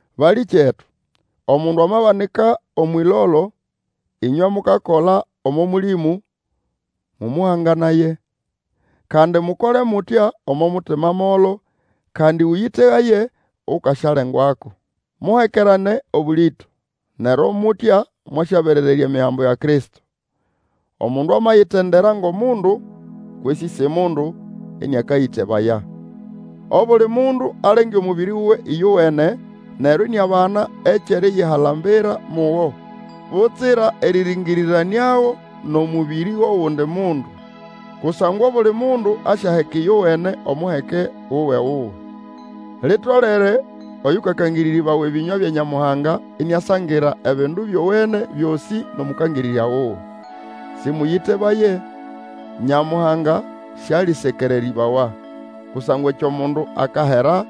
Balĩkyetu, omundu amabanika Omwʼĩlolo, ĩnywe mukakola omo Mũlĩmũ, mũmũhanganaye; kandi, mukole mutya omo mutima molo, kandi Ũyĩtegaye, ukasyalengwako. Muhekerane obũlĩto, neryo mutya mwasyaberererya Emigambo ya Kristo. Omundu amayitendera ngʼomundu, kwesĩ si mundu, ĩnĩakayĩtebaya. Obuli mundu alenge omubiri wuwe ĩyowene, neryo iniabana ekyʼeriyihalambira mugo, butsira erĩrĩngĩrĩranĩago nʼomũbĩrĩ wʼogundi mundu. Kusangwa obuli mundu asyaheka ĩyowene omuheke wuwe-wuwe. Litolere oyukakangĩrĩrĩbawa ebĩnywa bya Nyamuhanga iniasangira ebindu byowene byosĩ nʼOmũkangĩrĩrya wuwe. Sĩmũyĩtebaye, Nyamuhanga sialĩsekererĩbawa, kusangwa ekyo mundu akahera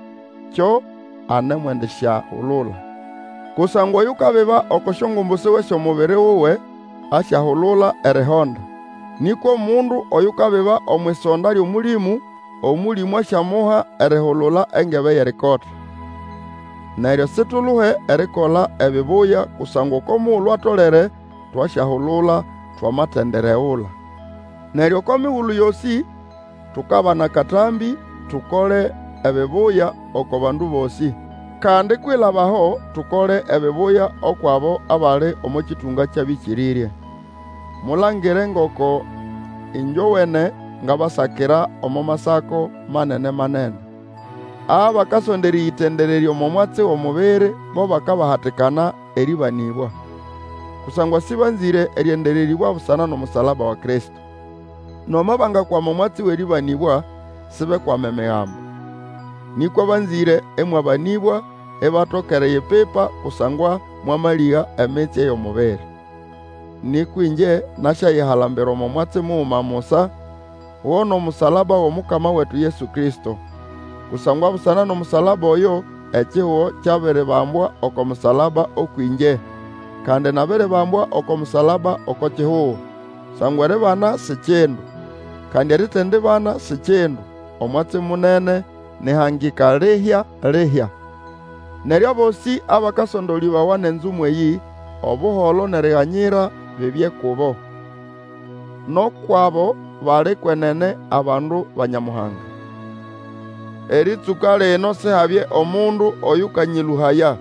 kyo anemwendisyahulula. Kusangwa oyukabiba oko syongumbu siwe syʼomubiri wuwe, asyahulula erihonda, nĩkwa omundu oyukabiba omwʼisonda lyʼOmũlĩmũ, Omũlĩmũ asyamuha erihulula engebe yʼerikota. Neryo situluhe erikola ebibuya kusangwa oko mugulu atolere twasyahulula twamatendiregula. Neryo oko migulu yosĩ tukabana akatambĩ, tokole ebibuya oko bandu bosĩ, kandi kwilaba aho tukole ebibuya ukwʼabo abali omo kĩtũnga kyʼabĩkĩrĩrye. Mulangire ngoko ĩngyowene ngabasakira omo masako manene-manene. Abakasonda erĩyĩtendererya omo mwatsi wʼomubiri, bo bakabahatikana erĩbanĩbwa, kusangwa sĩbanzĩre erĩendererĩbwa busana nʼomusalaba wa Kristo. Nomo bangakwama omwatsi wʼerĩbanĩbwa, sibekwama Emigambo. Nĩkwa banzĩre ĩmwabanĩbwa ibatoka eriyipipa kusangwa mwamalĩga emitsye yʼomubiri. Nĩkwa ĩngye nasyayihalambira omo mwatsi muguma musa, go nʼomusalaba wʼOmukama wetu Yesu Kristo. Kusangwa busana nʼomusalaba oyo ekihugo kyabiribambwa oko musalaba ũkwʼĩngye, kandi nabiribambwa oko musalaba oko kihugo. Kusangwa eribana si kindu, kandi eritendibana si kindu. Omwatsi munene nĩ ʼhangika lihya-lihya. Neryo abosĩ abakasondolĩbawa nʼenzumwa eyĩ, Obuholo nʼeriganyira bibye kubo, nʼukwʼabo bali kwenene abandu ba Nyamuhanga. Erĩtsũka lino Sihabye omundu oyũkanyĩlũhaya,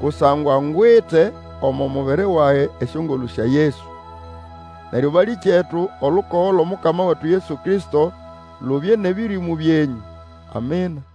kusangwa ngwite omo mubiri wage esyongolũ sya Yesu. Neryo balĩkyetu olukogo lwʼOmukama wetu Yesu Kristo lubye nʼebĩrĩmũ byenyũ. Amina.